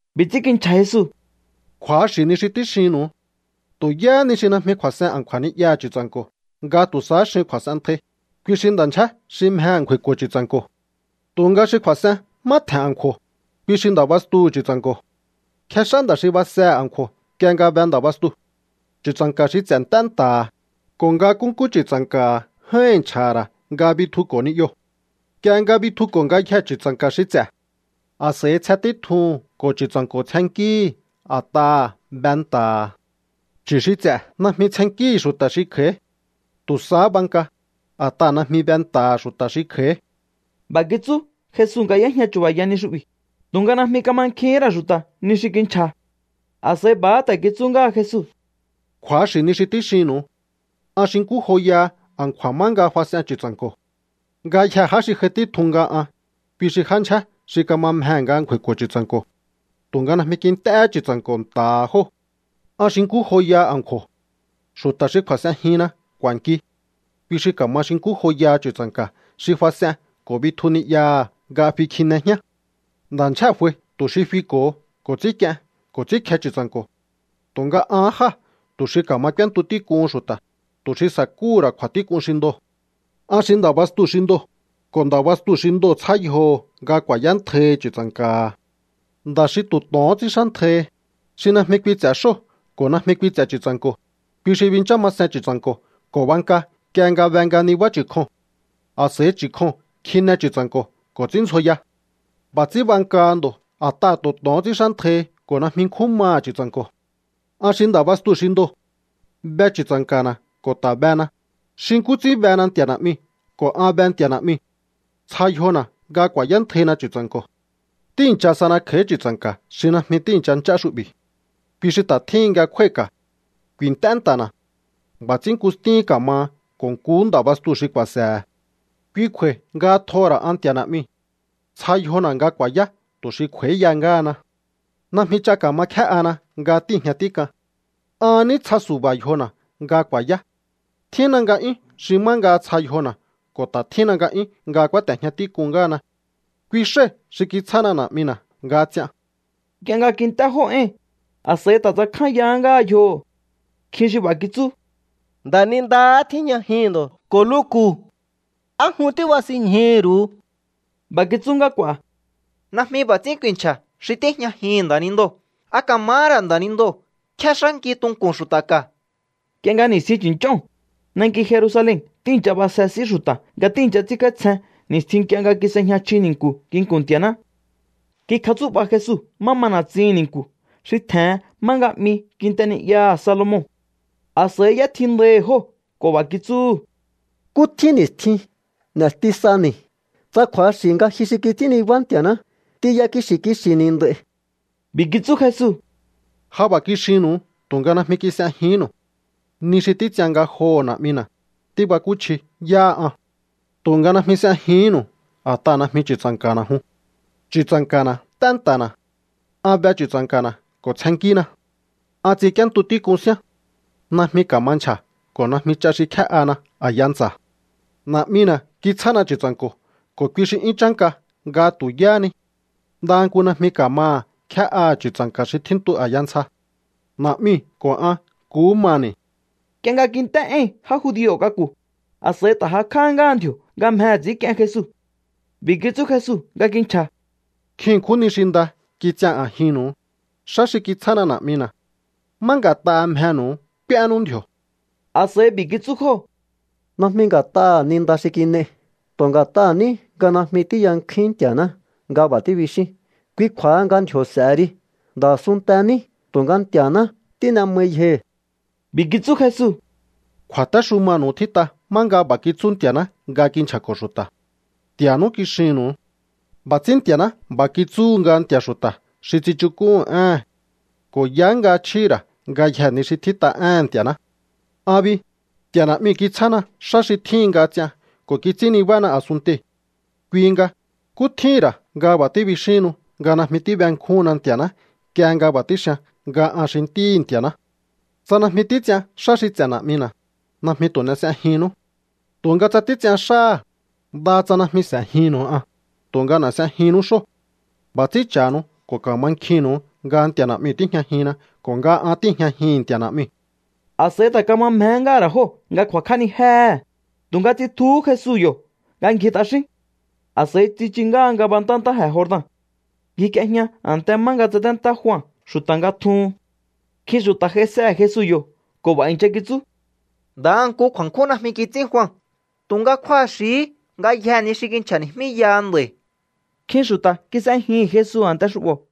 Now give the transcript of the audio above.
B'i̱ ts'ín kinchja̱ Jesu: —Kju̱axi̱ ni xi tíxinnu̱u. Tu̱ yáhá ni xi najmi kju̱a̱s'en a̱nkju̱a̱ ni'yaha̱ chu̱tsa̱nko̱ nga tu̱ sahá xin kju̱a̱s'enntjai, kui xi nda̱ ndyjé xi mjehe̱ ngju̱a̱i̱ko̱ chu̱tsa̱nko̱. Tu̱nga xi kju̱a̱s'en má tje̱n a̱nkju̱o̱, kui xi nda̱ bastuhu̱ chu̱tsa̱nko̱. Kjex'á nda̱ xi basehe̱ a̱nkju̱o̱ nk'ie nga be nda̱ bastuu̱. Chu̱tsa̱nka̱ xi ts'e̱ nt'é nta̱ha̱, ko̱ nga nkúnkú chu̱tsa̱nka̱ha̱ j'áíhi̱n nchja̱ha̱ ra̱ nga bitjuko̱ ni'yoo̱. Nk'ie nga bitjuko̱ ngayjee̱ chu̱tsa̱nka̱ xi ts'e̱, a̱s'a̱i tsjen títjuhu̱n ko̱ chu̱tsa̱nko̱ tsjennkíhi̱ a̱t'aha̱ be nta̱ha̱. Chu̱ xi ts'e̱ najmi tsjennkíhi̱ xu̱ta̱ xi kj'a̱í. Tu̱ sahá banka, a̱t'aha̱ najmi be nta̱ha̱ xu̱ta̱ xi kj'a̱í. B'a̱ kitsú Jesu nga y'éjña chu̱ba̱ya ni xu'bi̱. Tu̱nga najmi kamankjihín ra̱ xu̱ta̱ ni xi kinchja̱. A̱s'a̱i b'a̱há ta̱ kitsú ngáha Jesu: —Kju̱axi̱ ni xi tíxinnu̱u. An xi nkú joyaha a̱nkju̱a̱ má nga fas'en chu̱tsa̱nko̱. Ngayjee̱ já xi j'ai títjun nga an, kui xi já ndyjé xi kama mjehe̱ nga ngju̱a̱i̱ko̱ chu̱tsa̱nko̱. Tu̱nga najmi kint'éhé chu̱tsa̱nko̱ nta̱ha̱ jóo̱. An xi nkú joyaha a̱nkju̱o̱. Xu̱ta̱ xi kju̱a̱s'enjinna k'u̱a̱nki. Kui xi ka̱ma xi nkú joyaha chu̱tsa̱nka̱ xi fas'en ko̱ bitju ni'yaha̱ nga fi kjine jñá. ’Nda̱ ndyjée̱ f'ai tu̱ xi fiko̱ho ko̱ ts'ínk'ien ko̱ ts'ínkje chu̱tsa̱nko̱. Tu̱nga ahán jáa̱ tu̱ xi ka̱ma k'úéntu tík'uhun xu̱ta̱, tu̱ xi sa̱kúhu̱ ra̱ kju̱a̱tík'un xi ndoo̱. An xi nda̱ bastu xi ndoo̱, ko̱ nda̱ bastu xi ndoo̱ tsjá yjoho̱ nga ku̱a̱yántjaihi chu̱tsa̱nka̱ha̱. Nda̱ xi tu̱ to̱ohón ts'ínxántjaihi, xi najmi kui ts'e̱ xóo̱ ko̱ najmi kui ts'e̱ chu̱tsa̱nko̱, kui xi binchá masen chu̱tsa̱nko̱ ko̱ banka nk'ie nga be nga nibá chu̱ kjoo̱n. A̱s'a̱i chu̱ kjoo̱n kjine chu̱tsa̱nko̱ ko̱ ts'ínndzjoya. B'a̱ ts'ín bankaha ndo̱ a̱t'aha̱ tu̱ to̱ohón ts'ínxántjaihi ko̱ najmi nkjún maha̱ chu̱tsa̱nko̱. ’An xi nda̱ bastu xi ndoo̱. Be chu̱tsa̱nka̱na̱ ko̱ ta̱ bena, xi nkú ts'ín bena Nti̱a̱ Na̱'miu̱ ko̱ an be Nti̱a̱ Na̱'miu̱. Tsja yjona̱ nga ku̱a̱yántjaihina chu̱tsa̱nko̱. Tíi̱ncha sana kj'a̱í chu̱tsa̱nka̱ xi najmi tíi̱ncha nch'á xu'bi̱. Kui xi ta̱ tjíhin nga kjúái̱ka̱. Ku̱i̱nt'é nta̱na̱. B'a̱ ts'ín nku stíhín ka̱maha ko̱ nkuhú nda̱ bastu xi ku̱a̱se̱he̱. ’Kui kju̱a̱i̱ nga tjoho̱ ra̱ an Nti̱a̱ Na̱'miu̱. Tsja yjona̱ nga ku̱a̱yá tu̱ xi kj'u̱a̱íya ngáhana. Najmi ch'a ka̱ma kjé'ana nga tíi̱jña tík'an. An ní tsja su̱ba̱ yjona̱ nga ku̱a̱yá. Tjínna nga'yún xi má nga tsja yjona̱ ko̱ ta̱ tjínna nga'yún nga kúáte̱jña tík'un ngáhana. Kui xái̱ xi kitsjána Na̱'mina̱ nga ts'ian. Nk'ie nga kint'é jóo̱ éi̱n, a̱s'a̱i ta̱ tsakjányahá ngáha yjoho̱. Nkjin xi b'a̱ kitsú: —Nda̱nindahá tíjñajihi̱n ndo̱ ko̱ luku̱. ¿Á jun tíbasinñjuhu̱ru̱u? B'a̱ kitsú ngá k'u̱a̱: —Najmi b'a̱ ts'ín ku̱i̱nchja̱ xi tíjñajihi̱n nda̱nindoo̱. ¿A ka̱mahá ra̱ nda̱nindoo̱ kjéx'ánki tunku̱n xu̱ta̱ ka̱? Nk'ie nga ni̱stjin chu̱nch'óo̱n, nanki Jerusalen tíi̱ncha b'asje s'í xu̱ta̱ nga tíi̱ncha ts'ínkj'áítsjen ni̱stjin nk'ie nga kis'ejña chji ni̱nku̱ nginku̱n Nti̱a̱ná. Kikjatsú'ba Jesu má ma na̱tsihi̱n ni̱nku̱ xi tje̱hen má nga 'mi Kinte Ni'yaha̱ Salomon. A̱s'a̱i y'étjindaihi̱ jóo̱ ko̱ b'a̱ kitsúhu̱: —¿Nkú tjín ni̱stjin n'e̱sti sani̱? Tsa kju̱axi̱ nga ji xi kits'ín nibá Nti̱a̱ná, t'inya kixi̱ kixi̱ni̱ nd'a̱i̱. B'i̱ kitsú Jesu: —Ja b'a̱ kixinnu̱u tu̱nga najmi kis'ejihínnu̱u. Ni xi títs'ian ngajoho̱ Na̱'mina̱, tíbakúchji yáha an. Tu̱nga najmi s'ejihínnu̱u a̱t'aha̱ najmi chu̱tsa̱nka̱na̱ jun. Chu̱tsa̱nka̱na̱ nt'é nta̱na̱. An be chu̱tsa̱nka̱na̱ ko̱ tsjennkína. An ts'ink'íéntu tík'un síán. Najmi ka̱ma ndyja̱ ko̱ najmi ch'a xi kjé'ana a̱ya ntsa̱. Na̱'mina̱ kitsjána chu̱tsa̱nko̱ ko̱ kui xi 'yún chánka nga tu̱ yáhá ni. Ndaha nku najmi ka̱maha̱ kjé'aha̱ chu̱tsa̱nka̱ xi tjíntu a̱ya ntsja. Na̱'miu̱ ko̱ an nkuhú maha̱ni̱. Nk'ie nga kint'é éi̱n já judio̱ k'aku̱, a̱s'a̱i ta̱ jakj'á ngáha ndji̱o̱ nga mjehe̱ ts'i̱ínk'ien Jesu. B'i̱ kitsú Jesu nga kinchja̱: —Nkjin ṉkjún ni xi nda kits'ian a̱jinnu̱u, xá xi kitsjána Na̱'mina̱. ¿Má nga̱t'aha̱ mjehe̱nu̱u k'úéhenú ndji̱o̱? A̱s'a̱i b'i̱ kitsú jóo̱: —Najmi nga̱t'aha̱ ni nda xi kin'ei. Tu̱ nga̱t'aha̱ ní nga najmi tíyankjúín Nti̱a̱ná nga b'a̱ tíbixín. Kui kju̱a̱ha nga ndji̱o̱ s'e̱he ri. Nda̱ a̱sunnte ní, tu̱nga Nti̱a̱náhá tín'e mai yjohi̱. B'i̱ kitsú Jesu: —Kju̱a̱téxumanu̱u tjít'a má nga b'a̱ kitsú Nti̱a̱ná nga kinchja̱ko̱ xu̱ta̱: “Nti̱a̱nú kixinnu̱u.” B'a̱ ts'ín Nti̱a̱ná b'a̱ kitsúhu nga nti̱a̱ xu̱ta̱ xi tsichuk'úhu̱n éhe̱n. Ko̱ yaá nga chjíhi̱ ra̱ ngayjee̱ ni xi tjít'a éhe̱n Nti̱a̱ná. An bi, Nti̱a̱ Na̱'miu̱ kitsjána xá xi tjíhin nga ts'ian ko̱ kits'ín nibána a̱sunntei̱. Kui nga, ¿nkú tjíhi̱n ra̱ nga b'a̱ tíbixíhinnu nga najmi tíbenkjúhunna Nti̱a̱ná nk'ie nga b'a̱ tíxian nga an xi Ntíhi̱ Nti̱a̱ná? Tsa najmi títs'ian xá xi ts'e̱ Na̱'mina̱, najmi tu̱ n'e s'ejinnú. Tu̱nga tsa títs'ian xáha̱, ndaha tsa najmi s'e̱jinnu̱u an, tu̱nga n'e̱ s'ejinnú xóo̱. B'a̱ ts'ín cha̱hanu ko̱ ka̱mankjinnu̱u nga Nti̱a̱ Na̱'miu̱ tíjñajinna ko̱ nga an tíi̱jñajihi̱n Nti̱a̱ Na̱'miu̱. A̱s'a̱i ta̱ kama mjehé ngáha̱ ra̱ jóo̱ nga ku̱a̱kj'ánijéhe̱, tu̱nga tsitjuhú Jesu yo̱ nga ngji t'axín. A̱s'a̱i tsichu ngáha ngabantá ntáje̱ Jordan. Ngjik'iejña a̱nte má nga tsaténtá Jua xu̱ta̱ nga tjuhun. Nkjin xu̱ta̱ xi j'aisehe̱ Jesu yo̱ ko̱ b'a̱ i̱ncha kitsú: —Ndaha nku kju̱a̱nkjún najmi kits'ín Jua, tu̱nga kju̱axi̱hí ngayjee̱ ni xi kinchja̱ni̱jmíyaha nda̱i̱. Nkjin xu̱ta̱ kis'ejihi̱n Jesu a̱nte xu'bo̱.